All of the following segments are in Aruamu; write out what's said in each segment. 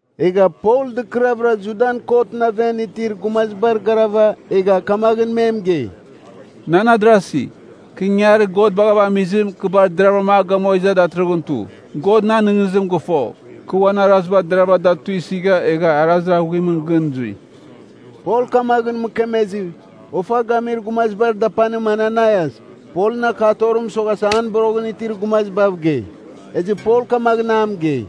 Egha Pol dɨkɨravɨra Judan kotɨn aven itir gumazibar garava egha kamaghɨn me mɨgei, “Nan adarasi, kɨ ingangarir God baghava amizim, kɨ bar deravɨra a gamua iza datɨrɨghɨn tu. God nan nɨghnɨzibagh fo, kɨ uan araziba deravɨra da tuisɨgha egha arazir aghuimɨn gɨn zui.” Pol kamaghɨn mɨkemezɨ, ofa gamir gumazibar dapanim, Ananaias Polɨn akatorim mɨsoghasa an boroghɨn itir gumazibav gei. Ezɨ Pol kamaghɨn a mɨgei,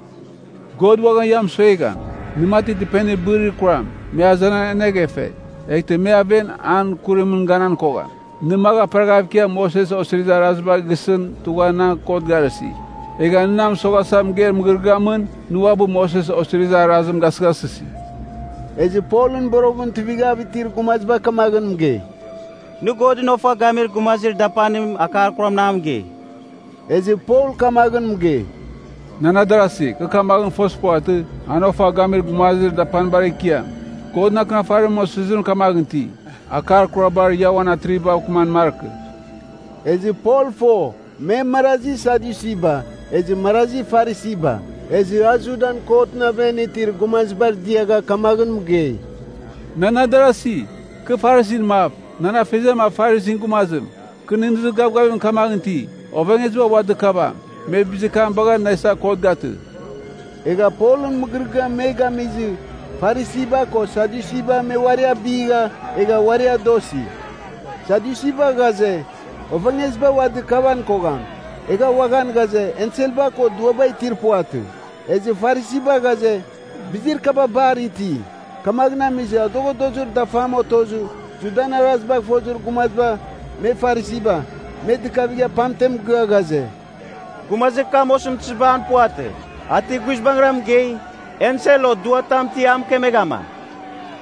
“God uaghan nɨ mɨsuegham! Nɨ mati dɨpenir bɨrir kuram, me azenan aneghefe. Eghtɨ me aven an kuramɨn ganan kogham. Nɨ magh aperaghav ikiava Moses Osirizir Arazibagh gisɨn tugha na kot garɨsi. Egha nɨ na mɨsoghasa mɨgeir mɨgɨrɨgɨamɨn nɨ uabɨ Moses Osirizir Arazim gasɨghasɨsi.” Ezɨ Polɨn boroghɨn tuivighav itir gumaziba kamaghɨn mɨgei, “Nɨ Godɨn ofa gamir gumazir dapanim akar kuramɨn a mɨgei.” Ezɨ Pol kamaghɨn mɨgei, “Nan adarasi, kɨ kamaghɨn fozir puvatɨ, an ofa gamir gumazir dapanir ekiam. Godɨn Akɨnafarimɨn osizirim kamaghɨn iti, ‘Akar kurabar ia uan atrivibav kɨman markɨ.’” Ezɨ Pol fo me marazi Sadyusiba, ezɨ marazi Farisiba. Ezɨ a Judan kotɨn aven itir gumazibar diagha kamaghɨn mɨgei, “Nan adarasi, kɨ Farisin mav, nan afeziam a Farisin gumazim. Kɨ nɨghnɨzir gavgavim kamaghɨn iti, ovengeziba ua dɨkavam. Me bizir kam bagha na isava kot gatɨ.” Egha Polɨn mɨgɨrɨgɨam me gamizɨ Farisiba ko Sadyusiba me uari abigha, egha uari adosi. (Sadyusiba ghaze, ovengeziba ua dɨkavan kogham, egha uaghan ghaze enselba ko duaba itir puvatɨ. Ezɨ Farisiba ghaze, bizir kaba bar iti.) Kamaghɨn amizɨ adoghadozir dafam otozɨ Judan arazibagh fozir gumaziba (me Farisiba), me dɨkavigha pamtem mɨgɨa ghaze, “Gumazir kam osɨmtɨziba an puvatɨ. A ti guizbangɨra mɨgei, ensel o duar tam ti a mɨkemeghama.”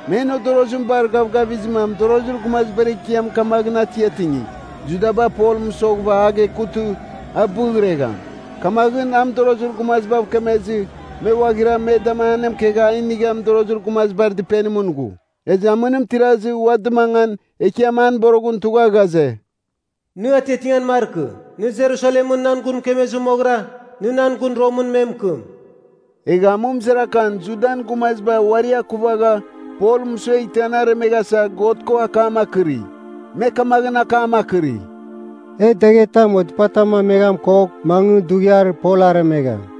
Men odorozim bar gavgavizɨma mɨdorozir gumazibar ekiam kamaghɨn atiatingi, Judaba Pol mɨsoghɨva a gekutɨ, a bɨghregham. Kamaghɨn a mɨdorozir gumazibav kemezɨ me ghuaghira me da anemɨkegha a inigha mɨdorozir gumazibar dɨpenimɨn ghu. Ezɨ amɨnim tirazɨ ua dɨmangan Ekiam an boroghɨn tugha ghaze, “Nɨ atiatingan markɨ! Nɨ Jerusalemɨn nan gun mɨkemezɨ moghɨra nɨ nan gun Romɨn me mɨkɨm.” Egha amɨmɨzarakan Judan gumaziba uari akuvagha Pol mɨsueghtɨ an aremeghasa God ko akam akɨri. Me kamaghɨn akam akɨri, “E daghetam o dɨpatam rameghan kogh, mangɨ dughiar Pol aremegham.”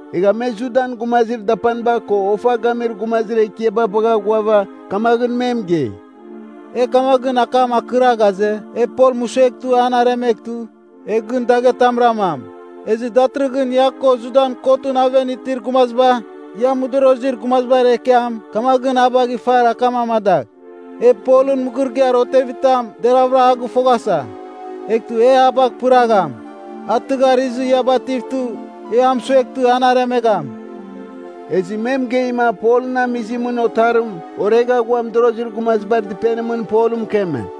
Egha me Judan gumazir dapaniba ko ofa gamir gumazir ekiaba bagha ghuava kamaghɨn me mɨgei, “E kamaghɨn akam akɨra ghaze, e Pol mɨsueghtɨ an aremeghtɨ, e gɨn daghetam ramam.” Ezɨ datɨrɨghɨn ia ko Judan kotɨn aven itir gumaziba, ia mɨdorozir gumazibar ekiam kamaghɨn a bagh ifar akam amadagh, “E Polɨn mɨgɨrɨgɨar otevitam deravɨra a gɨfoghasa. Eghtɨ e a bagh pɨragham. A tɨghar izɨ ia bativtɨ, e a mɨsueghtɨ an aremegham.” Ezɨ me mɨgeima Polɨn amizimɨn otarim oregha ghua mɨdorozir gumazibar dɨpenimɨn Pol mɨkeme.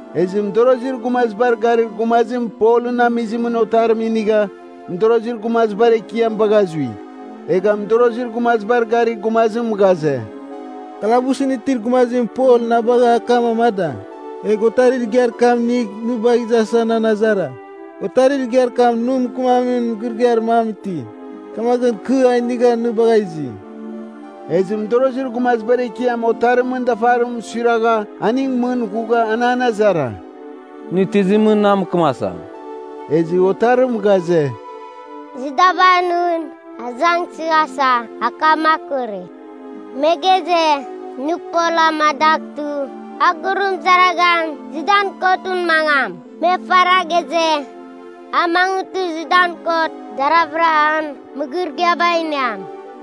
Ezɨ mɨdorozir gumazibar garir gumazim Polɨn amizimɨn otarim inigha mɨdorozir gumazibar ekiam bagha zui. Egha mɨdorozir gumazibar garir gumazim ghaze, “Kalabusɨn itir gumazim Pol na bagha akam amada. Egh otarir igiar kam inigh nɨ bagh izasa nan azara. Otarir igiar kam nɨ mɨkɨmamin mɨgɨrɨgɨar mam iti, kamaghɨn kɨ a inigha nɨ bagha izi.” Ezɨ mɨdorozir gumazibar ekiam otarimɨn dafarim suiragha aning mɨn ghugha an an azara, “Nɨ tizimɨn na mɨkɨmasa?” Ezɨ otarim ghaze, “Judaba nɨn azangsɨghasa akam akɨri. Me ghaze, nɨ Pol amadaghtɨ a gurumɨzaraghan Judan kotɨn mangam. Me ifara ghaze, a mangɨtɨ Judan kot deravɨra an mɨgɨrɨgɨaba iniam.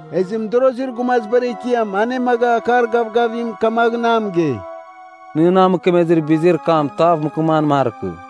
Ezɨ mɨdorozir gumazibar ekiam anemaga akar gavgavim kamaghɨn a mɨgei, “Nɨ na mɨkemezɨ bizir kam tav mɨkɨman markɨ.”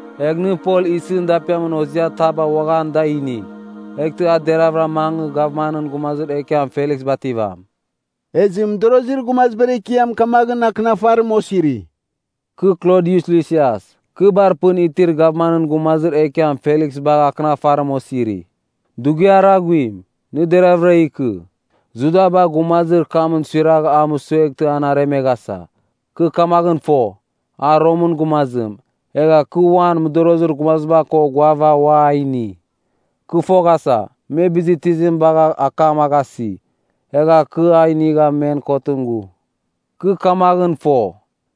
Egh nɨ Pol isɨn dapiamin hoziataba uaghan da inigh. Eghtɨ a deravɨra mangɨ gavmanɨn gumazir ekiam Feliks bativam.” Ezɨ mɨdorozir gumazibar ekiam kamaghɨn akɨnafarim osiri: Kɨ Klodius Lisias. Kɨ bar pɨn itir gavmanɨn gumazir ekiam Feliks bagha akɨnafarim osiri. Dughiar aghuim, nɨ deravɨra ikɨ. Judaba gumazir kamɨn suiragha a mɨsueghtɨ an aremeghasa. Kɨ kamaghɨn fo, a Romɨn gumazim, egha kɨ uan mɨdorozir gumaziba ko ghuava ua a ini. Kɨ foghasa, me bizir tizim bagha akam a gasi. Egha kɨ a inigha men kotɨn ghu. Kɨ kamaghɨn fo,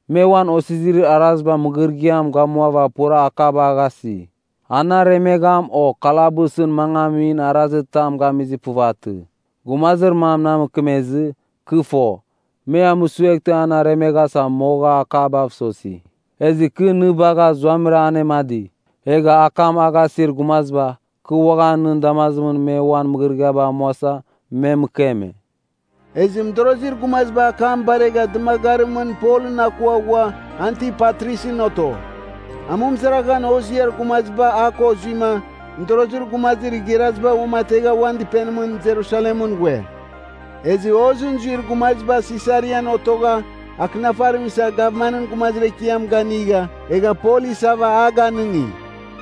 me uan osirizir arazibar mɨgɨrɨgɨam gamuava pura akaba a gasi. An aremegham o kalabusɨn mangamin arazitam gamizir puvatɨ. Gumazir man na mɨkemezɨ, kɨ fo, me a mɨsueghtɨ an aremeghasa, moga akabav sosi. Ezɨ kɨ nɨ bagha zuamɨra anemadi. Egha akam a gasir gumaziba, kɨ uaghan nɨn damazimɨn me uan mɨgɨrɨgɨabar amuasa, me mɨkeme. Ezɨ mɨdorozir gumaziba akam baregha dɨmagarimɨn Polɨn akua ghua Antipatrisɨn oto. Amɨmɨzaraghan hoziar gumaziba a ko zuima, mɨdorozir gumazir igharaziba uamategha uan dɨpenimɨn Jerusalemɨn ghue. Ezɨ hozɨn zuir gumaziba Sisarian otogha akɨnafarim isa gavmanɨn gumazir ekiam ganɨga egha Pol isava a ganɨngi.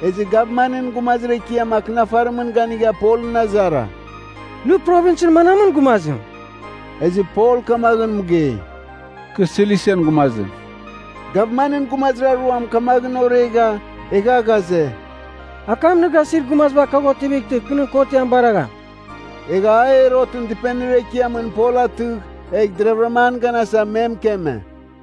Ezɨ gavmanɨn gumazir ekiam akɨnafarimɨn ganigha Polɨn azara, “Nɨ provinsɨn manamɨn gumazim?” Ezɨ Pol kamaghɨn mɨgei, “Kɨ Silisian gumazim.” Gavmanɨn gumazir aruam kamaghɨn oregha, egha ghaze, “Akam nɨ gasir gumaziba kagh otivightɨ kɨ nɨn kotiam baragham.” Egha a Herotɨn dɨpenir ekiamɨn Pol atɨgh egh deravɨram an ganasa, me mɨkeme.